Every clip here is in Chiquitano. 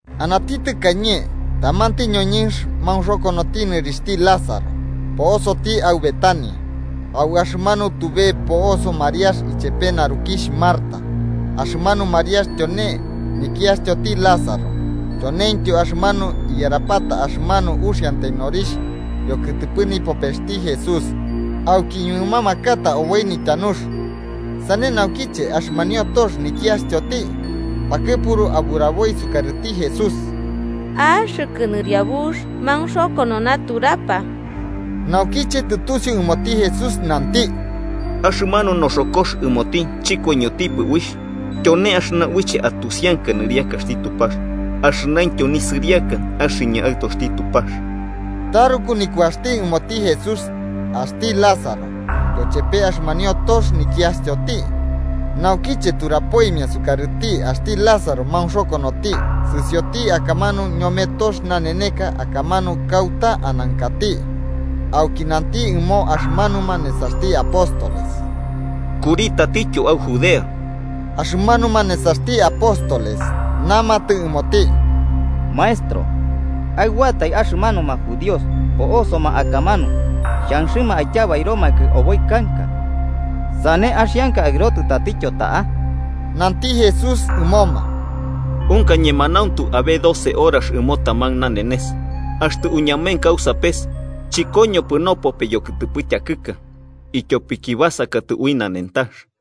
Anati tɨkañe tamanti ñoñɨnx maunxokonoti nɨrixhti Lázaro, po'osoti au Betania, au axɨmanu tube po'oso Mariax ichepe narukixh Marta. Axɨmanu Mariax tyone nikiastyoti Lázaro tyoneintyo axɨmanu iyarapata axɨmanu uxiantai norixh yokɨtɨpɨ nipopesti Jesús auki iñuɨmamakata oboi nityanux. Sane Naukiche, axɨmanio tox nikiastyoti pakɨpuru aburaboi sukarɨti Jesús: –Axɨkɨ Nɨriabux, maunxokono naturapa. Naukiche tɨtusiu ɨmoti Jesús, nanti: –Axɨmanu noxokox ɨmoti chɨkoiñotipɨ uixh, tyone axɨna uiche atusianka nɨriakaxti Tupax, axɨnaintyo nisɨriaka axɨñɨ Aɨtoxti Tupax. Taruku nikuaxɨma ɨmoti Jesús axti Lázaro yochepe axɨmanio tox nikiastyoti, naukiche turapoimia sukarɨti axti Lázaro maunxokonoti, sɨsiotiki akamanu ñome tox naneneka akamanu kauta anankati. Auki nanti ɨmo axɨmanuma nesaxti apóstoles: –Kuri tatityo au Judea. Axɨmanuma nesaxti apóstoles namatɨ ɨmoti: –Maestro, aɨboatai axɨmanuma judíos po'osoma akamanu xhanxɨma aityabairomakɨ oboi kanka, ¿sane axianka aɨrotɨ tatityo ta'a? Nanti Jesús ɨmoma: –¿Unka ñemanauntu abe doce horax ɨmo taman nanenes? Axtɨ uñamenka au sapes, chɨkoñopɨ nopope yokɨtɨpɨ tyakɨka, ityopiki basakatɨ ui nanentax.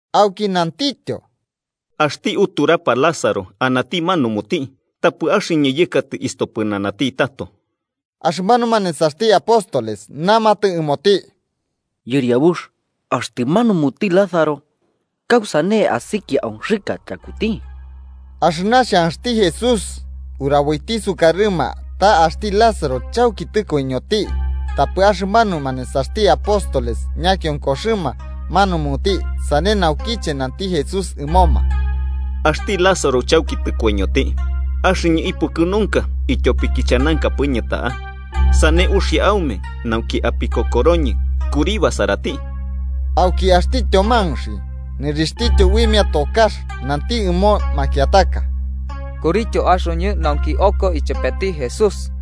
Auki nantityo: –Axti uturapa Lázaro anati manumuti, tapɨ axɨñɨ yɨkatɨ istopɨnanati tato. Axɨmanuma nesaxti apóstoles namatɨ ɨmoti: –Yɨriabux, axtɨ manumuti Lázaro kausane asikia onxɨka tyakuti. Axɨna xhanxti Jesús uraboiti sukarɨma ta axti Lázaro chauki tɨkoiñoti, tapɨ axɨmanuma nesaxti apóstoles ñakionkoxɨma manumuti. Sane naukiche nanti Jesús ɨmoma: –Axti Lázaro chauki tɨkoiñoti. Axɨñɨ ipukɨnunka ityopiki chanankapɨñɨ ta'a, sane uxia aume nauki apikokoroñɨ. Kuri basarati. Auki axti Tyomanxi nɨrixhtityo uimia tokax, nanti ɨmo makiataka: –Kurityo axoñɨ nauki oko ichepeti Jesús.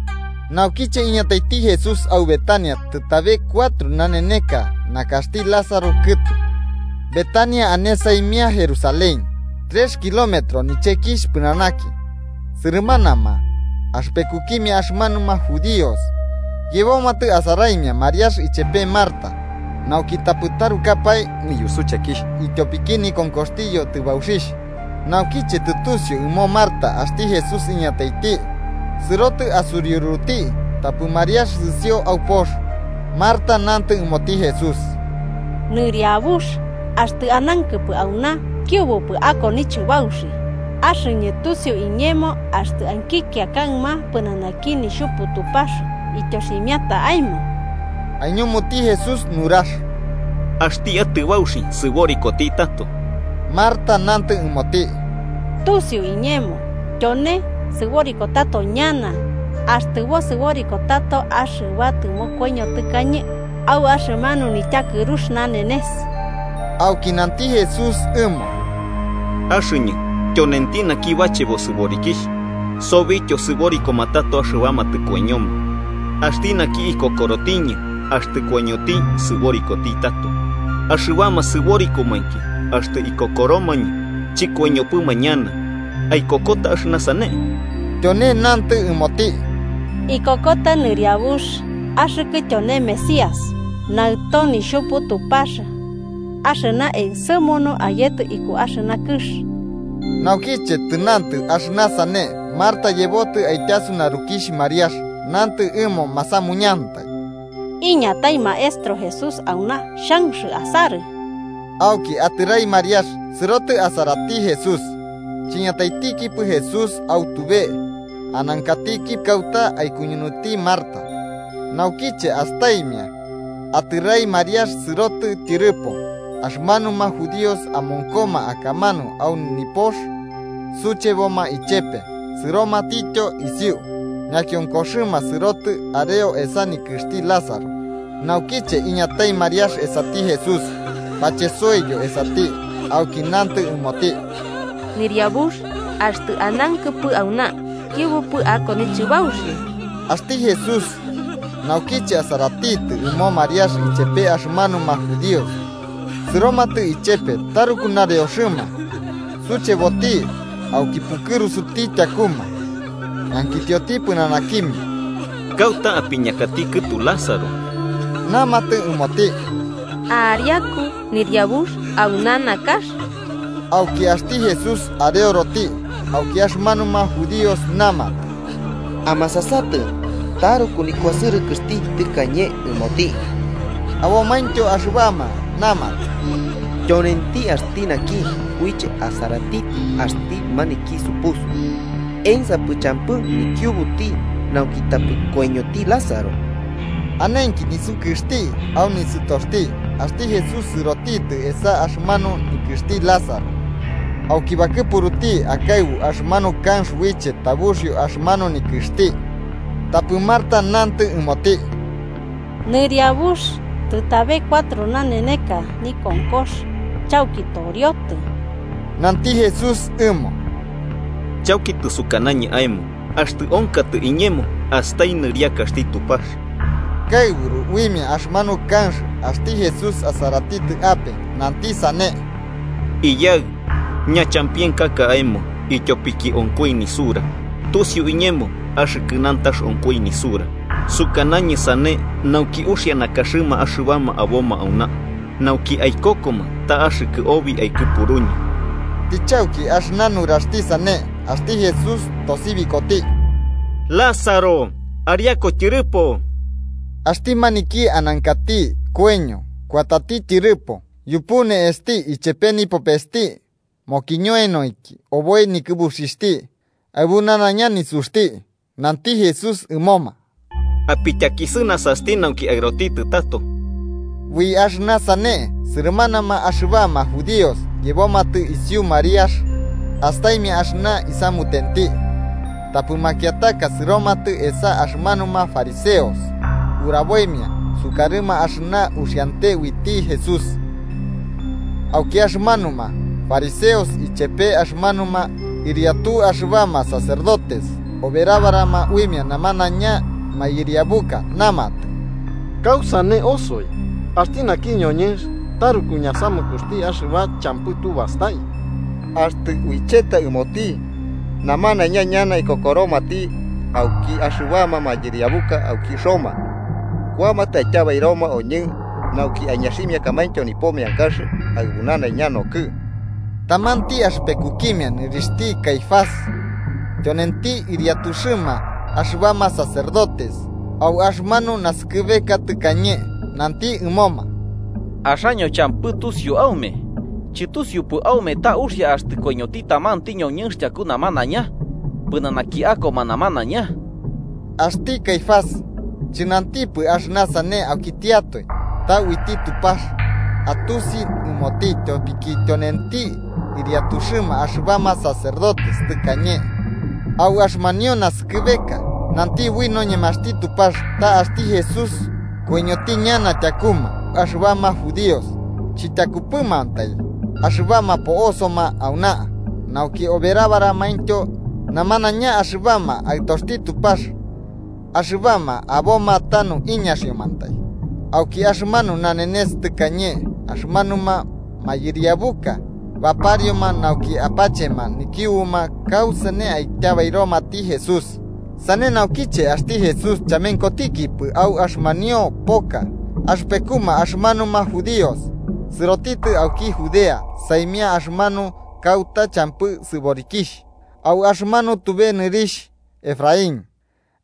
Naukiche iñataiti Jesús au Betania, tɨtabe cuatro naneneka nakaxti Lázaro kɨtu. Betania ane saimia Jerusalén, trex kilómetros nichekixh pɨnanaki. Sɨrɨmanama axɨpekukimia axɨmanuma judíos yebomatɨ asaraimia Mariax ichepe Marta, nauki tapɨ trukapae niyusuchekixh ityopiki nikonkoxti yotɨbauxixh. Naukiche tɨtusiu ɨmo Marta axti Jesús iñataiti, sɨrotɨ asuriuruti. Tapɨ Mariax sɨsio au pox. Marta nantɨ ɨmoti Jesús: –Nɨriabux, axtɨ anankɨpɨ auna, kiubupɨ ako nichɨbauxi. Axɨñɨ tusiu iñemo axtɨ ankikia kaɨma pɨnanaki Nixhupu Tupax ityoximiata aemo. Aiñumuti Jesús nurax: –Axti atɨbauxi sɨborikoti tato. Marta nantɨ ɨmoti: –Tusiu iñemo, tyone sɨboriko tato ñana axtɨ bosɨboriko tato axɨba tɨmokoiño tɨkañe, au axɨmanu nityakɨrux nanenes. Auki nanti Jesús ɨmo: –Axɨñɨ tyonenti naki bachebo sɨborikixh, sobityo sɨborikoma tato axɨbama tɨkoiñoma. Axti naki ikokorotiñɨ, axtɨ koiñoti sɨborikoti tato. Axɨbama sɨborikomainki axtɨ ikokoromañɨ, chikoiñopɨma ñana. ¿Aikokota axɨna sane? Tyone nantɨ ɨmoti: –Ikokota Nɨriabux, axɨkɨ tyone Mesías, Naɨto Nixhupu Tupax axɨna ensɨmunu ayetɨ iku axɨna kɨx. Naukiche tɨnantɨ axɨna sane, Marta yebotɨ aityasu narukixh Mariax, nantɨ ɨmo masamuñantai: –Iñatai Maestro Jesús auna, xhanx asarɨ. Auki atɨrai Mariax, sɨrotɨ asarati Jesús. Chiñataitikipɨ Jesús au tube, anankatiki kauta aikuñunuiti Marta. Naukiche astaimia atɨrai Mariax sɨrotɨ tyɨrɨpo, axɨmanuma judíos amonkoma akamanu au nipox, sucheboma ichepe, sɨromatityo isiu ñakiokoxɨma sɨrotɨ areo esa nikɨxti Lázaro. Naukiche iñatai Mariax esati Jesús, bachesoiyo esati, auki nantɨ ɨmoti: –Nɨriabux, axtɨ anankɨpɨ auna, kiubupɨ ako nichɨbauxi. Axti Jesús, naukiche asaratitɨ ɨmo Mariax ichepe axɨmanuma judíos sɨromatɨ ichepe taruku nareoxɨma, sucheboti auki pukɨrusuti tyakuma. Ñankitioti pɨnanakimia: –¿Kauta apiñakati kɨtu Lázaro? Namatɨ ɨmoti: –Ariaku Yɨriabux, auna nakaxti. Auki axti Jesús areoroti. Auki axɨmanuma judíos namatɨ: –¡Amasasatɨ, taruku nikuasɨrɨkɨxti tɨkañe ɨmoti! Abomaintyo axɨbama namatɨ: –Tyonenti axti naki uiche asaratitɨ axti maniki supusu, ¿ensapɨ champɨ nikiubuti nauki tapɨ koiñoti Lázaro? Anenki nisukɨxti au nisɨtoxti, axti Jesús sɨrotitɨ esa axɨmanu nikɨxti Lázaro. Auki bakɨpuruti akaɨbu axɨmanu kanx uiche tabuxio axɨmanu nikɨxti. Tapɨ Marta nantɨ ɨmoti: –Nɨriabux, tɨtabe cuatro naneneka nikonkox, chauki toriotɨ. Nanti Jesús ɨmo: –Chauki tɨsukanañɨ aemo, axtɨ onkatɨ iñemo, astai nɨriakaxti Tupax. Kaɨburu uimia axɨmanu kanx, axti Jesús asaratitɨ ape, nanti sane: –Iyaɨ, ñachampienkaka aemo ityopiki onkoi nisura. Tusiu iñemo axɨkɨ nantax onkoi nisura, sukanañɨ sane nauki uxia nakaxɨma axɨbama aboma auna, nauki aikokoma ta axɨkɨ obi aikɨpuruñɨ. Tɨchauki axɨna nuraxti sane, axti Jesús tosibikoti: –¡Lázaro, ariaku tyɨrɨpo! Axti maniki anankati koiño kuatati tyɨrɨpo, yupu ne'esti ichepe nipopesti mokiñoenoinki oboi nikɨbuxixhti aɨbu nanaiña nisuxti. Nanti Jesús ɨmoma: –Apityakisɨnasasti nauki aɨrotitɨ tato. Ui axɨna sane sɨrɨmanama axɨbama judíos yebomatɨ isiu Mariax astaimia axɨna isamutenti. Tapɨ makiataka sɨromatɨ esa axɨmanuma fariseos uraboimia sukarɨma axɨna uxiante uiti Jesús. Auki axɨmanuma fariseos ichepe axɨmanuma ɨriatu axɨbama sacerdotes oberabarama uimia namanaiña mayɨriabuka, namatɨ: –¿Kausane osoi? Axti naki ñoñɨnx taruku ñasamukuxti axɨba champɨ tu bastai. Axtɨ uicheta ɨmoti, namanaiña ñana ikokoromati, auki axɨbama mayɨriabuka auki Roma kuamatɨ aityabairoma oñɨ nauki aiñaximiakamaintyo nipo meankax aɨbu nanaiña nokɨɨ. Tamanti axɨpekukimia nɨrixhti Caifás, tyonenti ɨriatuxɨma axɨbama sacerdotes au axɨmanu nasɨkɨbeka tɨkañe, nanti ɨmoma: –Axaño champɨ tusiu aume, chɨtusiupɨ aume ta uxia axtɨ koiñoti tamanti ñoñɨnx tyaku namanaiña, pɨnanaki akoma namanaiña. Axti Caifás chɨnantipɨ axɨna sane aukitiatoe, ta uiti Tupax atusi ɨmoti tyopiki tyonenti ɨriatuxɨma axɨbama sacerdotes tɨkañe au axɨmanio naskɨbeka, nanti ui noñemaxti Tupax ta axti Jesús koiñoti ñana tyakuma axɨbama judíos. Chityakupɨmantai axɨbama po'osoma auna, nauki oberabaramaintyo namanaiña axɨbama aɨtoxti Tupax axɨbama aboma tanu iñaxiomantai. Auki axɨmanu nanenes tɨkañe axɨmanuma mayɨriabuka baparioma nauki apachema nikiubuma kausane aityabairomati Jesús. Sane naukiche axti Jesús chamenkotikipɨ au axɨmanio poka axɨpekuma axɨmanuma judíos, sɨrotitɨ auki Judea saimia axɨmanu kauta champɨ sɨborikixh, au axɨmanu tube nobɨrixh Efraín.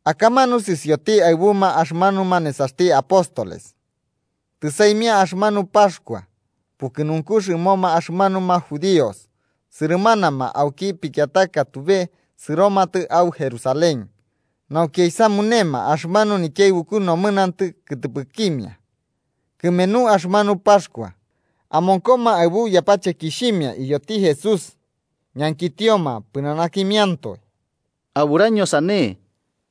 Akamanu sɨsioti aɨbuma axɨmanuma nesaxti apóstoles. Tɨsaimia axɨmanu Paxkua pukɨnunkux ɨmoma axɨmanuma judíos, sɨrɨmanama auki pikiataka tube sɨromatɨ au Jerusalén nauki aisamunema axɨmanu nikiaɨbuku nomɨnantɨ kɨtɨpɨkimia kɨmenu axɨmanu Paxkua. Amonkoma aɨbu yapachekixhimia iyoti Jesús, ñankitioma pɨnanakimiantoe. –¿Aburaño sane?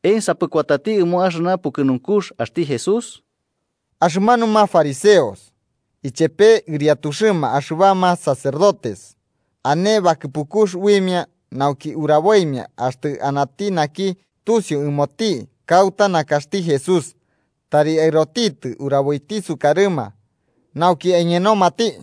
¿Ensapɨ kuatati ɨmo axɨna pukɨnunkux axti Jesús? Axɨmanuma fariseos ichepe ɨriatuxɨma axɨbama sacerdotes ane bakɨpukux uimia, nauki uraboimia axtɨ anati naki tusiu ɨmoti kauta nakaxti Jesús, tari aɨrotitɨ uraboiti sukarɨma, nauki aiñenomati.